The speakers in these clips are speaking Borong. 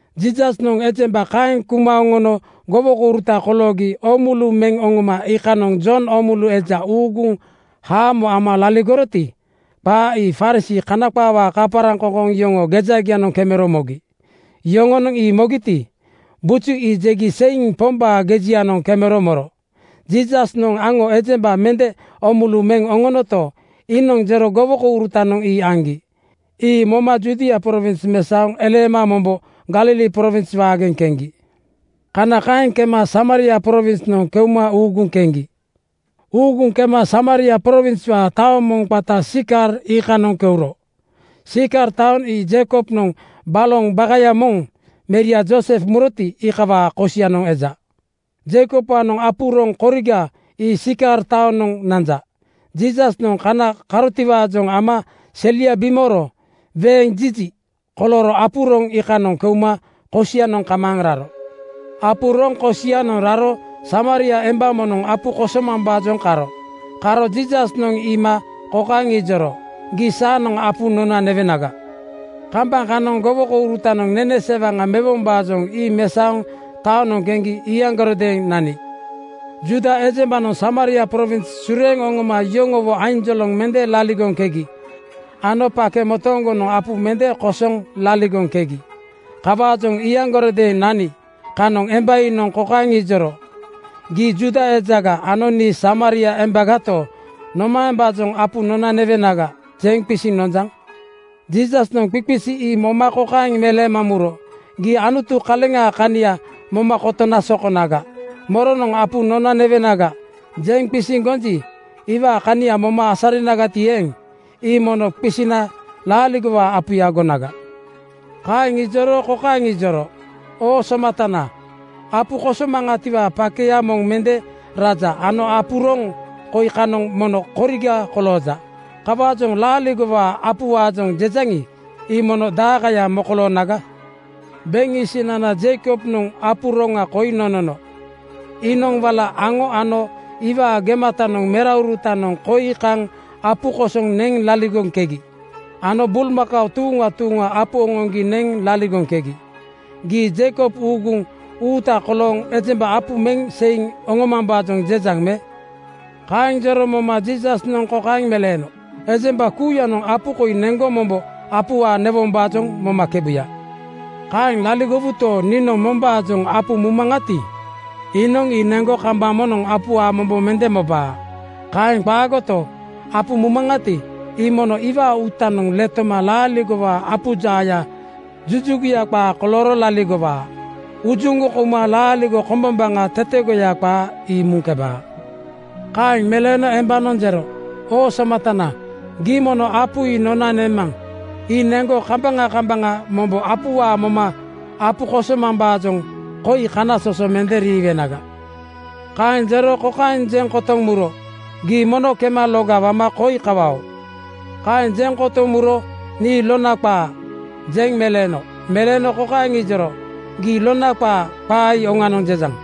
Jiisasnoŋ ejemba kaeŋ kuma oŋono gowokouruta koloogi oomulu meŋ oŋoma iikanoŋ Jon Oomulu eja uuguŋ haamo ama laligoroti, qaa ii Farisii (Kana qaawaa kaparaŋkoŋkoŋ) yoŋoo gejagianoŋ kemero mogi. Yoŋonoŋ ii mogiti, buju ii jegi seiŋ Pombaa gejianoŋ kemero moro. Jiisasnoŋ aŋo ejemba mende oomulu meŋ oŋonoto, iinoŋ jero gowokourutanoŋ ii aŋgi. Ii moma Judia prowins mesaoŋ eleema mombo Galili prowins waageŋ keŋgi. Kana kaeŋ kema Samaria prowinsnoŋ keuma uuguŋ keŋgi. Uuguŋ kema Samaria prowinswaa taoŋ moŋ qata Sikar iikanoŋ keuro. Sikar taoŋ ii Jeikobnoŋ baloŋ bakaya moŋ meria Joosef muroti, iikawaa kosianoŋ eja. Jeikobwaanoŋ apu roŋ koriga ii Sikar taonoŋ nanja. Jiisasnoŋ kana karotiwaajoŋ ama selia bimooro weeŋ jiji kolooro apu roŋ iikanoŋ keuma kosianoŋ kamaaŋ raro. Apu roŋ kosianoŋ raro Samaria emba moŋnoŋ apu kosomambaajoŋ karo. Karo Jiisasnoŋ iima kokaeŋ ijoro, “Gii saanoŋ apu nona newenaga.” Kambaŋ kanoŋ gowokourutanoŋ nene sewaŋa mewombaajoŋ ii mesaoŋ taonoŋ keŋgi iyaŋgarodeeŋ nani. Juuda ejembanoŋ Samaria prowins sureeŋ oŋoma yoŋowo ainjoloŋ mende laligoŋkegi ano pake motooŋgonoŋ apu mende kosoŋ laligoŋkegi. Kawaajoŋ iyaŋgarodeeŋ nani kanoŋ emba iinoŋ kokaeŋ ijoro, “Gii Juuda ejaga ano nii Samaria embagato, nomaembaajoŋ ‘Apu nona newenaga,’ jeŋ qisiŋ nonjaŋ?” Jiisasnoŋ qiqisi ii moma kokaeŋ meleema muro, “Gii Anutu kaleŋaa kania moma kotona sokonaga. Moronoŋ ‘Apu nona newenaga,’ jeŋ qisiŋ gonji, iwaa kania moma asarinagati eeŋ, ii mono qisina laaligowaa apuya gonaga.” Kaeŋ ijoro kokaeŋ ijoro, “Oo somatana, apu kosomaŋatiwaa pakeya moŋ mende raja ano apu roŋ koi kanoŋ mono koriga kolooja. Kawaajoŋ laaligowaa apuwaajoŋ jejaŋi, ii mono daaŋkaya mokoloonaga? Beŋ isinana Jeikobnoŋ apu roŋa koi nonono. Iinoŋ wala aŋo ano iwaa gematanoŋ meraurutanoŋ koi kaŋ apu kosoŋ neŋ laligoŋkegi ano bulmakao tuuŋa tuuŋa apu oŋoŋgi neŋ laligoŋkegi. Gii Jeikob uuguŋ uuta kolooŋ ejemba apu meŋ seiŋ oŋomambaajoŋ jejaŋ me?” Kaeŋ jero moma Jiisasnoŋ kokaeŋ meleeno, “Ejemba kuuyanoŋ apu koi neŋgo mombo apuwaa newombaajoŋ momakebuya. Kaeŋ laligowuto, niinoŋ mombaajoŋ apu mumaŋati, iinoŋ ii neŋgo kambaŋ moŋnoŋ apuwaa mombo mende mobaa. Kaeŋ qaagoto, apu mumaŋati, ii mono iwaa uutanoŋ letoma laaligowaa apu jaaya jujuguya qaa kolooro laligowaa. Ujuŋgoŋ kouma laaligo kombombaŋa tetegoya qaa ii muŋkebaa.” Kaeŋ meleeno embanoŋ jero, “Oo somatana, gii mono apu ii nona nemaŋ. Ii neŋgo kambaŋa kambaŋa mombo apuwaa moma apu kosomambaajoŋ koi kanasoso mende riiwenaga.” Kaeŋ jero kokaeŋ jeŋ kotoŋ muro, “Gii mono kema loga wama koi kawao.” Kaeŋ jeŋ kotoŋ muro “Nii lona qaa,” jeŋ meleeno. Meleeno kokaeŋ ijoro, “Gii ‘Lona qaa,’ qaa ii oŋanoŋ jejaŋ.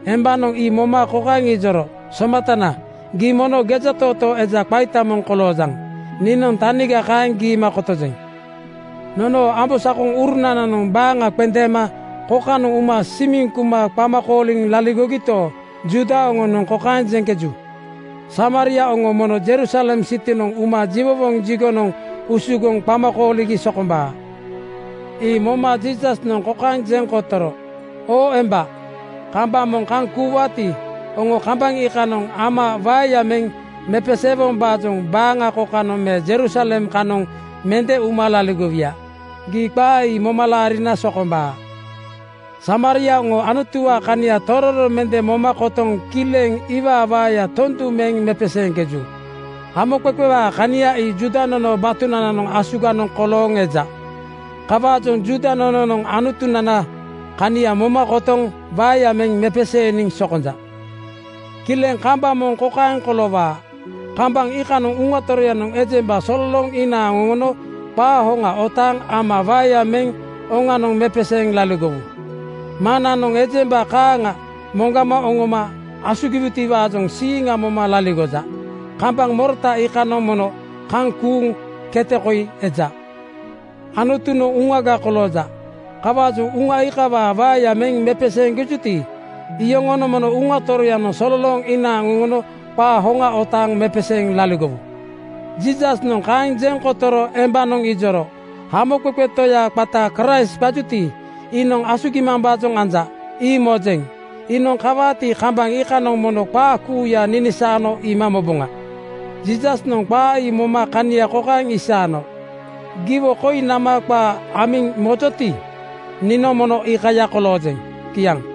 Embanoŋ ii moma kokaeŋ ijoro, “Somatana, gii mono gejatootoo eja qaita moŋ koloojaŋ. Niinoŋ taniga kaeŋ giima kotojeŋ. Nonoo ambosakoŋurunananoŋ baaŋa qendeema kokanoŋ uma simiŋ kuma qama kooliŋ laligogito, Juuda oŋonoŋ kokaeŋ jeŋkeju, ‘Samaria oŋo mono Jerusalem sitinoŋ uma jiwowoŋ jigonoŋ usugoŋ qama kooligi sokombaa.’ Ii moma Jiisasnoŋ kokaeŋ jeŋ kotoro, “Oo emba, kambaŋ moŋ kaŋ kuuwaati, oŋo kambaŋ iikanoŋ Ama waeya meŋ mepesee-wombaajoŋ baaŋa kokanoŋ me Jerusalem kanoŋ mende uma laligowuya. Gii qaa ii moma laarina sokombaa. Samaria oŋo Anutuwaa kania tororo mende moma kotoŋ kileŋ iwaa waeya tondu meŋ mepeseeŋkeju. Hamoqeqewaa kania ii Juuda nonoo batunananoŋ asuganoŋ kolooŋ eja. Kawaajoŋ Juuda nononoŋ Anutunanaa kania moma kotoŋ waeya meŋ mepeseeniŋ sokonja. “Kileŋ kambaŋ moŋ kokaeŋ koloowaa: Kambaŋ iikanoŋ Uŋa Toroyanoŋ ejemba sololooŋ inaaŋ oŋono qaa hoŋa otaaŋ Ama waeya meŋ oŋanoŋ mepeseeŋ laligowu. Maŋnananoŋ ejemba kaaŋa moŋgama oŋoma asugiwutiwaajoŋ siiŋa moma laligoja. Kambaŋ morota iikanoŋ mono kaŋ kuuŋ kete koi eja. Anutunoŋ Uŋaga kolooja. Kawaajoŋ Uŋa iikawaa waeya meŋ mepeseeŋkejuti, iyoŋonoŋ mono Uŋa Toroyanoŋ sololooŋ inaaŋ oŋono qaa hoŋa otaaŋ mepeseeŋ laligowu.” Jiisasnoŋ kaeŋ jeŋ kotoro embanoŋ ijoro, “Hamoqeqe Toya qata Kraist qajuti, iinoŋ asugimambaajoŋ anja, ii mojeŋ. Iinoŋ kawaati, kambaŋ iikanoŋ mono qaa kuuya ninisaano iima moboŋa.” Jiisasnoŋ qaa ii moma kania kokaeŋ isaano, “Giwo koi nama qaa amiŋ mojoti, niinoŋ mono iikaya koloojeŋ.” Kiaŋ.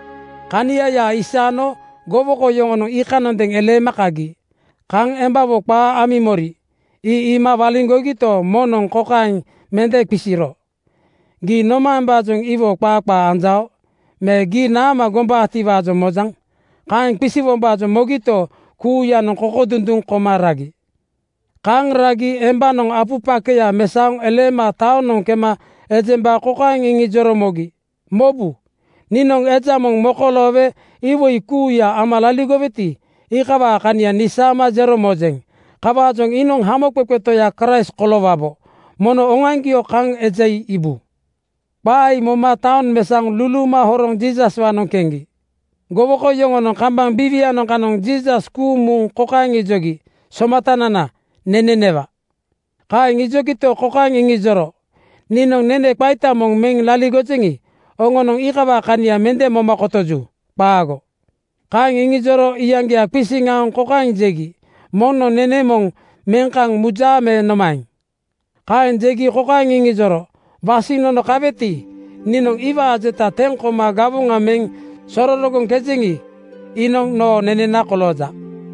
Kaniaya isaano gowoko yoŋonoŋ iikanondeeŋ eleema kagi. Kaŋ embawo qaa amiŋ mori, ii iima waliŋgogito, moŋnoŋ kokaeŋ mende qisiro, “Gii nomaembaajoŋ iwo qaa qaa anjao?” me “Gii naama gombaatiwaajoŋ mojaŋ?” Kaeŋ qisiwombaajoŋ mogito, kuuyanoŋ kokodunduŋ koma ragi. Kaaŋ ragi embanoŋ apu pakeya mesaoŋ eleema taonoŋ kema ejemba kokaeŋ iŋijoro mogi, “Mobu! Niinoŋ eja moŋ mokoloowe iwoi kuuya ama laligoweti, iikawaa kania nisaama jero mojeŋ. Kawaajoŋ iinoŋ Hamoqeqe Toya Kraist koloowabo. Mono oŋoaŋgio kaŋ eja ii iibu.” Qaa ii moma taoŋ mesaoŋ luluuma horoŋ Jiisaswaanoŋ keŋgi. Gowoko yoŋonoŋ kambaŋ biiwianoŋ kanoŋ Jiisas kuuŋ muŋ kokaeŋ ijogi, “Somatanana, nene newa.” Kaeŋ ijogito, kokaeŋ iŋijoro, “Niinoŋ nenena qaita moŋ meŋ laligojeŋi, oŋonoŋ iikawaa kania mende moma kotoju. Qaago.” Kaeŋ iŋijoro iyaŋgia qisiŋ aoŋ kokaeŋ jegi, “Moŋnoŋ nene moŋ meŋ kaŋ mujaa me nomaeŋ?” Kaeŋ jegi kokaeŋ iŋijoro, “Wasiŋ nono kaweti, niinoŋ iwaa jeta teŋ koma gawoŋa meŋ sororogoŋkejeŋi, iinoŋ noo neneana kolooja.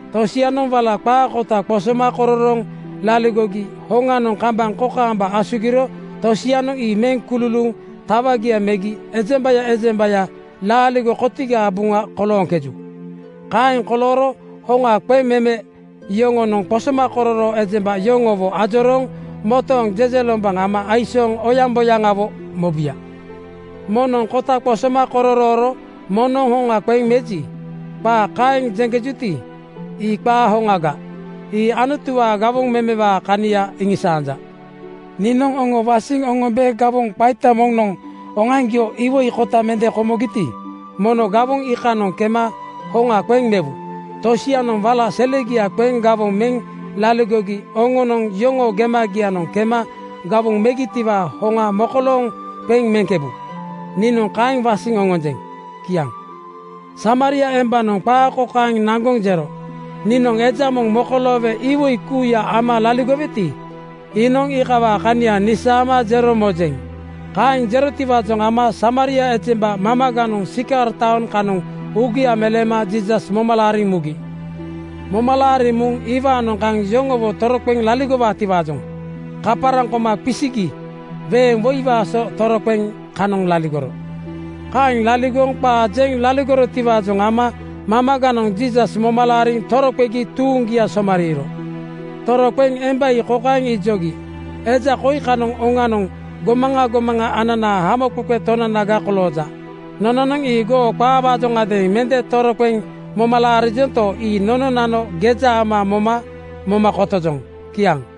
Tosianoŋ wala qaa kota qosoma kororooŋ laligogi hoŋanoŋ kambaŋ kokaamba asugiro tosianoŋ ii meŋ kululuuŋ tawagia megi ejembaya ejembaya laaligo kotigaa buŋa kolooŋkeju. Kaeŋ kolooro hoŋa qeŋmeme yoŋonoŋ qosomakororoo ejemba yoŋowo ajorooŋ motooŋ jejelombaŋ ama aisooŋ oyaŋboyaŋawo mobuya. ‘Moŋnoŋ kota qosoma kororooro moŋnoŋ hoŋa qeŋ meji,’ qaa kaeŋ jeŋkejuti, ii qaa hoŋaga. Ii Anutuwaa gawoŋ memewaa kania iŋisaanja. Niinoŋ oŋo wasiŋ oŋombe gawoŋ qaita moŋnoŋ oŋoaŋgio iwoi kota mende komogiti, mono gawoŋ iikanoŋ kema hoŋa qeŋ mewu. Tosianoŋ wala selegia qeŋ gawoŋ meŋ laligogi oŋonoŋ yoŋoo gemagianoŋ kema gawoŋ megitiwaa hoŋa mokolooŋ qeŋ meŋkebu. Niinoŋ kaeŋ wasiŋ oŋonjeŋ.” Kiaŋ Samaria embanoŋ qaa kokaeŋ naŋgoŋ jero, “Niinoŋ eja moŋ mokoloowe iwoi kuuya ama laligoweti, iinoŋ iikawaa kania nisaama jero mojeŋ.” Kaeŋ jerotiwaajoŋ ama Samaria ejemba mamaganoŋ Sikar taoŋ kanoŋ uugia meleema Jiisas moma laariŋ mugi. Moma laariŋ muŋ iwaanoŋ kaŋ yoŋowo toroqeŋ laligowaatiwaajoŋ kaparaŋ koma qisigi weeŋ woiwaa so toroqeŋ kanoŋ laligoro. Kaeŋ laligoŋ qaa jeŋ laligorotiwaajoŋ ama mamaganoŋ Jiisas moma laariŋ toroqegi tuuŋgia somariiro. Toroqeŋ emba ii kokaeŋ ijogi, “Eja koi kanoŋ oŋanoŋ gomaŋa gomaŋa ananaa Hamoqeqe Tonanaga kolooja. Nononoŋ ii goo qaawaajoŋadeeŋ mende toroqeŋ moma laarijonto, ii nononano geja ama moma moma kotojoŋ.” Kiaŋ.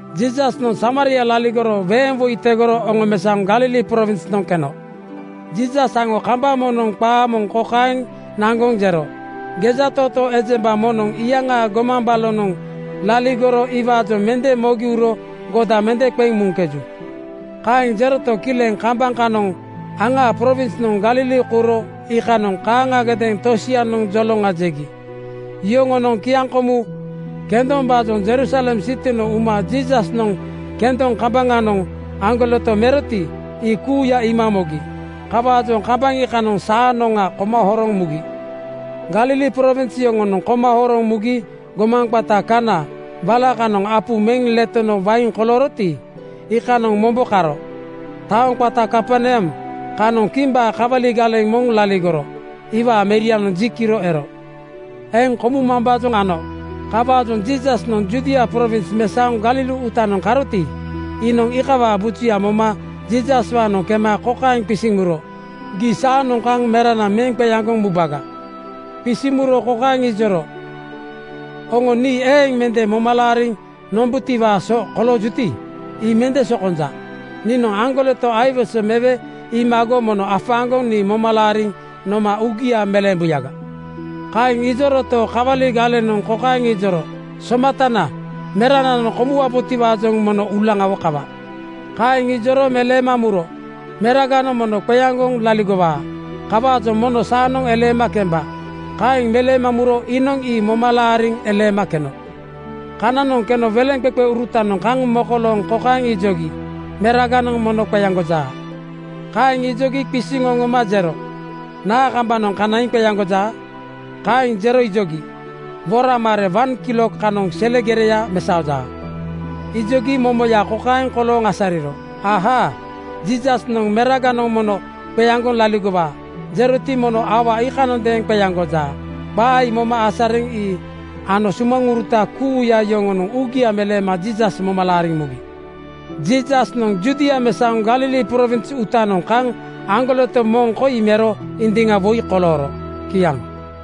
Jiisasnoŋ Samaria laligoro weeŋ woi tegoro oŋomesaoŋ Galili prowinsnoŋ keno. Jiisas aŋo kambaŋ moŋnoŋ qaa moŋ kokaeŋ naŋgoŋ jero, “Gejatootoo ejemba moŋnoŋ iyaŋaa gomaŋ balonoŋ laligoro iwaajoŋ mende mogi uro goda mende qeŋ muŋkeju.” Kaeŋ jeroto, kileŋ kambaŋ kanoŋ aŋaa prowinsnoŋ Galili kouro iikanoŋ kaaŋagadeeŋ tosianoŋ joloŋa jegi. Yoŋonoŋ kiaŋkomu kendombaajoŋ Jerusalem sitinoŋ uma Jiisasnoŋ kendoŋ kambaŋanoŋ aŋgoleto meroti, ii kuuya iima mogi. Kawaajoŋ kambaŋ iikanoŋ saanoŋa koma horoŋ mugi. Galili prowins yoŋonoŋ koma horoŋ mugi gomaŋ qata Kaana wala kanoŋ apu meŋ letono wain kolooroti, iikanoŋ mombo karo. Taoŋ qata Kaperneam kanoŋ kimbaa kawali galeŋ moŋ laligoro. Iwaa merianoŋ ji kiro ero. Eŋ komumambaajoŋ ano. Kawaajoŋ Jiisasnoŋ Judia prowins mesaoŋ Galili uutanoŋ karoti, iinoŋ iikawaa bujuya moma Jiisaswaanoŋ kema kokaeŋ qisiŋ muro, “Gii saanoŋ kaŋ merana meŋ qeaŋgoŋ mubaga.” Qisiŋ muro kokaeŋ ijoro, “Oŋo nii eeŋ mende moma laariŋ nombutiwaa so koloojuti, ii mende sokonja. Niinoŋ aŋgoleto aiwese mewe iimago mono afaaŋgoŋ nii moma laariŋ noma uugia meleembuyaga.” Kaeŋ ijoroto, kawali galenoŋ kokaeŋ ijoro, “Somatana, merananoŋ komuwabotiwaajoŋ mono uulaŋawo kawa.” Kaeŋ ijoro meleema muro, “Meraganoŋ mono qeaŋgoŋ laligowaa. Kawaajoŋ mono saanoŋ eleema kemba.” Kaeŋ meleema muro iinoŋ ii moma laariŋ eleema keno. Kananoŋ keno weleŋqeqeurutanoŋ kaŋ mokolooŋ kokaeŋ ijogi, “Meraganoŋ mono qeaŋgojaa.” Kaeŋ ijogi qisiŋ oŋoma jero, “Naa kambanoŋ kanaiŋ qeaŋgojaa?” Kaeŋ jero ijogi, “Woraŋ mare wan kilok kanoŋ sele gereya mesaojaa.” Ijogi momoya kokaeŋ kolooŋ asariro: Ahaa! Jiisasnoŋ “Meraganoŋ mono qeaŋgoŋ laligowaa,” jeroti, mono aua iikanondeeŋ qeaŋgojaa. Qaa ii moma asariŋ ii ano sumaŋuruta kuuya yoŋonoŋ uugia meleema Jiisas moma laariŋ mugi. Jiisasnoŋ Judia mesaoŋ Galili prowins uutanoŋ kaŋ aŋgoleto moŋ koi mero indiŋa woi kolooro. Kiaŋ.